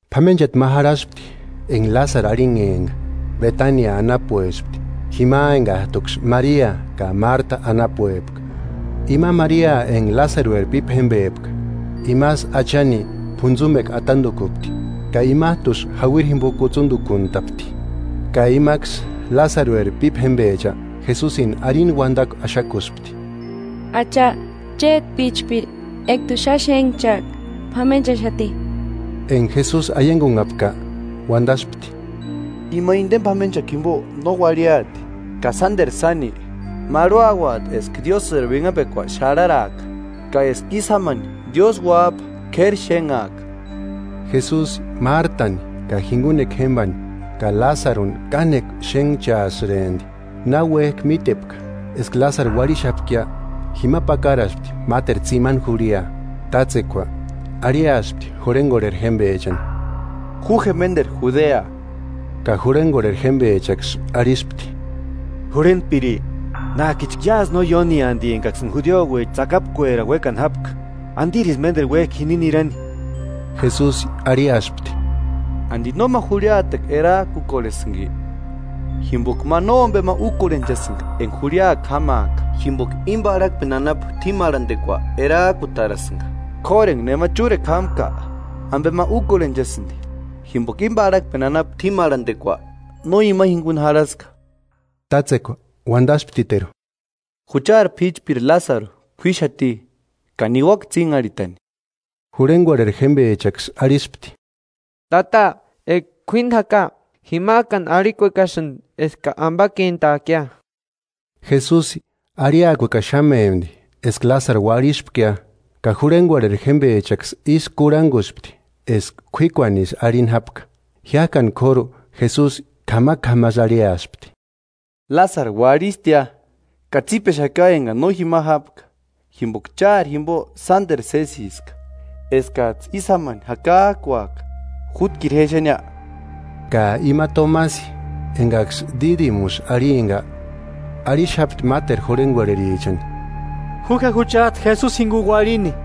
P'amenchati ma jarhaspti enga Lásaru arhinhempka, Betania anapuespti, jima engajtuksï Maria ka Marta anapuepka. Ima Maria, enga Lásarueri pípa jémbepka, imasï Achani p'untsumekua atandukupti ka imajtusï jauiri jimbo kutsundukuntapti. Ka imaksï Lásarueri pípa jémbecha Jesusini arini uandakua axakuspti: –Acha, chéti p'íchpiri enga t'u xáni xénhchajka p'amenchaxati. Enga Jesusi aiangunhapka, uandaspti: –Ima indeni p'amenchakua jimbo no uarhiati, ka sánderu sáni, marhuauati eska Diósïri uinhapekua xarharaaka, ka eska ísï jámani Diósï uájpa k'éri xénhaaka. Jesusi Mártani ka jingunekua jémbani ka Lásaruni kánekua xénhchaasïrempti. Na uéjki mítepka eska Lásaru uarhixapkia jima pakaraspti máteru tsimani jurhia. Tátsekua arhiaspti jurhengorheri jémbechani: –Ju je ménderu Judea. Ka jurhengorheri jémbechaksï arhispti: –Jurhentpiri, nájkichka iásï no ióni andi engaksïni judiouecha tsakapkuerani uékani jápka, ¿Andirisï ménderu uéjki jini nirani? Jesusi arhiaspti: –¿Andi no ma jurhiatekua erajkukorhesïnki? Jimboka ma nómbema úkorhenchasïnga enga jurhiakua jámaaka, jimboka íni parhakpeni anapu t'ímarhandekua erajkutarasïnga; k'óru enga nema chúrekua jámka, ambe ma úkorhenchasïndi jimboka íni parhakpeni anapu t'ímarhandekua no ima jinguni jarhaska. Tátsekua uandasptiteru: –Juchari p'íchpiri Lásaru k'uíxati, ka niuaka tsínharhitani. Jurhengorheri jémbechaksï arhispti: –Tata, eka k'uíni jaka, jimajkani arhikuekasïndi eska ambakentaakia. Jesusi arhiakuekaxamempti eska Lásaru uarhispkia, ka jurhengorheri jémbechaksï ísï kurhanguspti eska k'uíkuanisï arhini jápka. Jiájkani k'óru Jesusi k'amak'amasï arhiaspti: –Lásaru uarhistia. Ka tsípexaka engani no jima jápka, jimboka chári jimbo sánderu sésiska, eskajtsï ísï jámani jakajkuaka. Jútkiru je exenia. Ka ima Tomasi engaksï Dídimusï arhimpka, arhixapti máteru jurhengorherichani: –Ju je juchajtu Jesusi jinguni uarhini.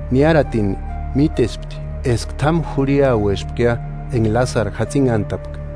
Niáratini mítespti eska t'ámu jurhiauespkia enga Lásaru jatsinhantapka.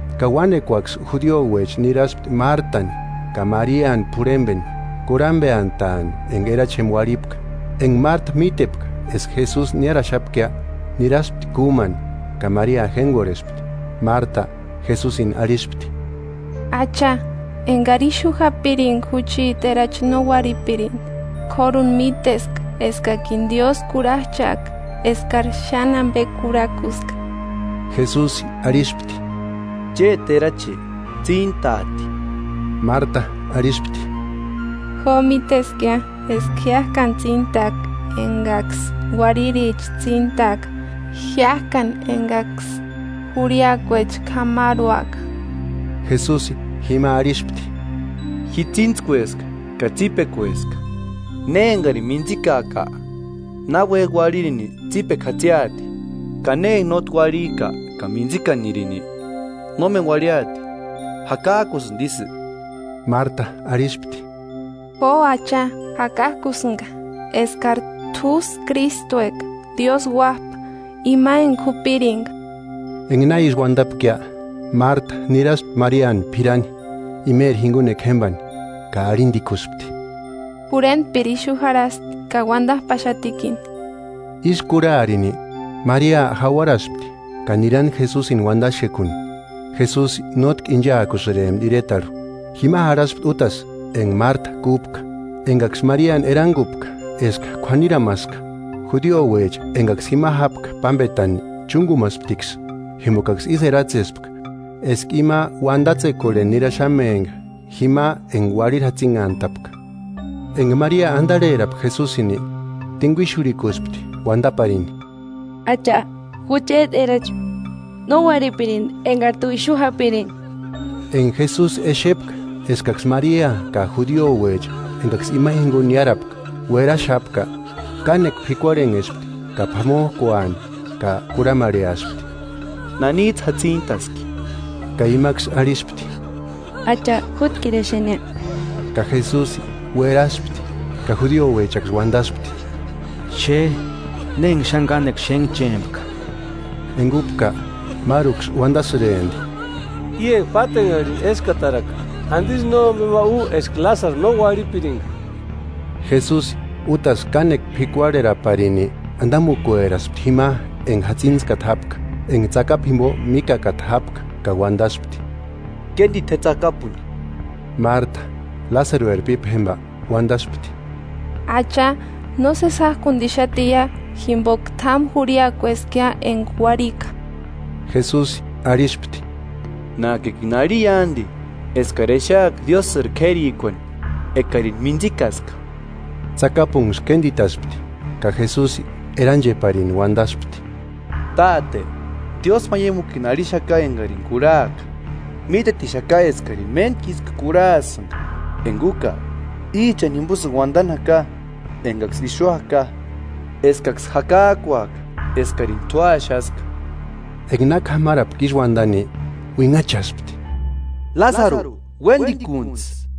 ka uánekuaksï judiouecha niraspti Mártani ka Mariani p'urhembeni, kurhambeantaani enga erachi jémba uarhipka. Enga Marta mítepka eska Jesusi niáraxapkia, niraspti kúmani; ka Maria jéngorhespti. Marta Jesusini arhispti: –Acha, ekari ixu japiringa jucheti erachi no uarhipirindi. Kóruni míteska eskakini Diósï kurhajchaaka eskari xáni ambe kurhakuska. Jesusi arhispti: –Chéti erachi tsíntaati. Marta arhispti: –Jo, míteskia eska jiájkani tsíntaaka engaksï uarhiricha tsíntaaka, jiájkani engaksï jurhiakuecha k'amarhuaka. Jesusi jima arhispti: –Ji tsíntskueska ka tsípekueska, ne engarini mintsikaaka, náuejki uarhini, tsipekua jatsiati; ka ne enga nótki uarhijka ka mintsikanirini, nómeni uarhiaati. ¿Jakajkusïndi isï? Marta arhispti: –Jo, Acha, jakajkusïnga eskari t'úsï Krístueka, Diósï Uájpa, ima enga jupiringa. Enga na ísï uandapkia, Marta niraspti Mariani p'irani, imeri jingunekua jémbani, ka arhindikuspti: Jurhentpiri ixu jarhasti ka uandajpaxatikini. Ísï kurharini, Maria jauarapaspti ka nirani Jesusini uandaxekuni. Jesusi nótki inchaakusïrempti iretarhu; jima jarhaspti útasï enga Marta kúpka. Engaksï Mariani erangupka eska k'uaniramaska, judiouecha engaksï jima jápka pámbetani chúngumasptiksï, jimbokaksï ísï eratsespka eska ima uandatsekorheni niraxamempka jima enga uarhiri jatsinhantapka. Enga Maria andarherapka Jesusini, tinguixurhikuspti uandaparini: –Acha, jucheti erachi no uarhipirindi engari t'u ixu japiringa. Enga Jesusi exepka eskaksï Maria ka judiouecha engaksï ima jinguni niárapka uéraxapka, kánekua p'ikuarhenhespti ka p'amojkuani, ka kurhamarheaspti: –¿Nanijtsï jatsintaski? Ka imaksï arhispti: –Acha, jútkiru exenia. Ka Jesusi ueraspti. Ka judiouechaksï uandaspti: –¡Xe na enga xáni kánekua xénhchempka! Enga úpka, máruksï uandasïrempti: –I enga pátenharhini éskataraka, ¿Andisï nómbema u eska Lásaru no uarhipiringa? Jesusi útasï kánekua p'ikuarheraparini andamukueraspti jima enga jatsintskata jápka, enga tsakapu jimbo míkakata jápka. Ka uandaspti: –Kéndita je tsakapuni. Marta, Lásarueri pípa jémba uandaspti: –Acha, nósesi jájkundixatiia jimboka t'ámu jurhiakueskia enga uarhika. Jesusi arhispti: –Nájkikini arhia andi eskari exeaka Diósïri k'érikuani ekarini mintsikaska. Tsakapunksï kénditaspti, ka Jesusi erancheparini uandaspti: –Táte, diósmaiamukini arhixaka engarini kurhaka. Mítetixaka eskarini méntku isï kurhasïnga, enga úka, íchani jimbosïni uandani jaka engaksï ixu jaka, eskaksï jakajkuaka eskarini t'u axaska. Enga na k'amarapka ísï uandani, uinhachaspti: –¡Lásaru, uéndikuntsï!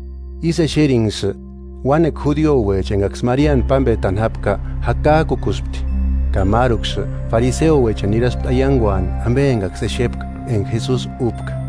Ísï exerinksï, uánekua judiouecha engaksï Mariani pámbetani jápka jakajkukuspti. Ka máruksï fariseouechani niraspti aianguani ambe engaksï exepka enga Jesusi úpka.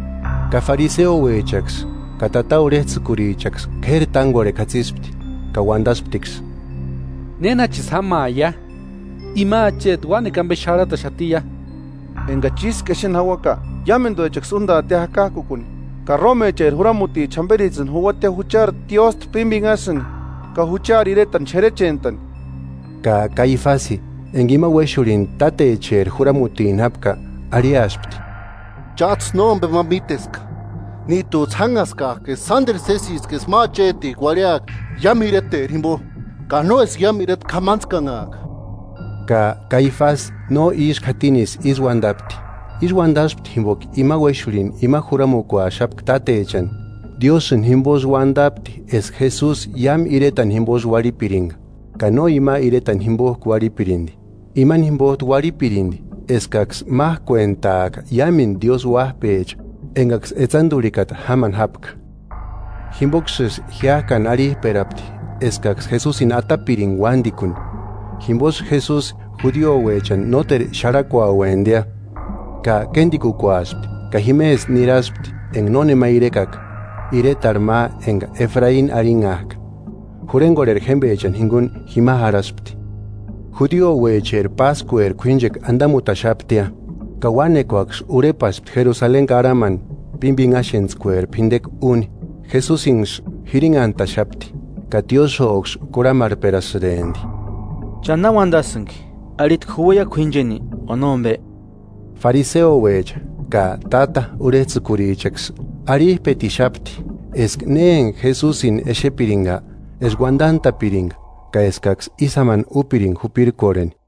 Ka fariseouechaksï ka táta urhejtsïkurichaksï k'éri tángorhekua jatsipti, ka uandasptiksï: –¿Nénachisï jámaia? Ima acheti uánekua ambe xarhataxatiia. Engachi ísku exeni jauaka, iámenduechaksï úndaatia jakajkukuni, ka rómecheri juramuticha jamberijtsïni juuatia juchari tiósta pímbinhasïni ka juchari iretani xerechentani. Ka Kaifasi, enga ima uéxurhini tátecheri juramutini jápka, arhiaspti: –Chájtsï nómbema míteska, níjtujtsï jánhaskajki eska sánderu sésiska eska ma achetijku uarhiaka iámu ireteri jimbo, ka no eska iámendu ireta k'amantskanhaaka. Ka Kaifasi no ísku jatinisï ísï uandapti, ísï uandaspti jimboka ima uéxurhini ima juramukuaxapka tátechani, Diósïni jimbosï uandapti eska Jesusi iámu iretani jimbosï uarhipiringa; ka no ima iretani jimbojku uarhipirindi, imani jimbojtu uarhipirindi eskaksï májkuentaaka iámendu Diósï uájpecha engaksï etsandurikata jámani jápka. Jimboksïsï jiájkani arhijperapti eskaksï Jesusini atapiringa uándikuni. Jimbosï Jesusi judiouechani nóteru xarhakuauemptia, ka kéndikukuaspti ka jimesï niraspti enga nónema irekaka, iretarhu ma enga Efraini arhinhajka. Jurhegorheri jémbechani jinguni jima jarhaspti. Judiouecheri páskueri k'uínchekua andamutaxaptia, ka uánekuaksï urhepaspti Jerusaleni karhamani pímbinhaxentskueri p'indekua úni. Jesusinksï jirinhantaxapti ka tiósïoksï kurhamarhperasïrempti: –¿Cha na uandasïnki? ¿Arhitki juuaia k'uíncheni, o nómbe? Fariseouecha, ka táta urhejtsïkurichaksï arhijpetixapti eska ne enga Jesusini exepiringa, eska uandantapiringa ka eskaksï ísï jámani úpiringa jupirkorheni.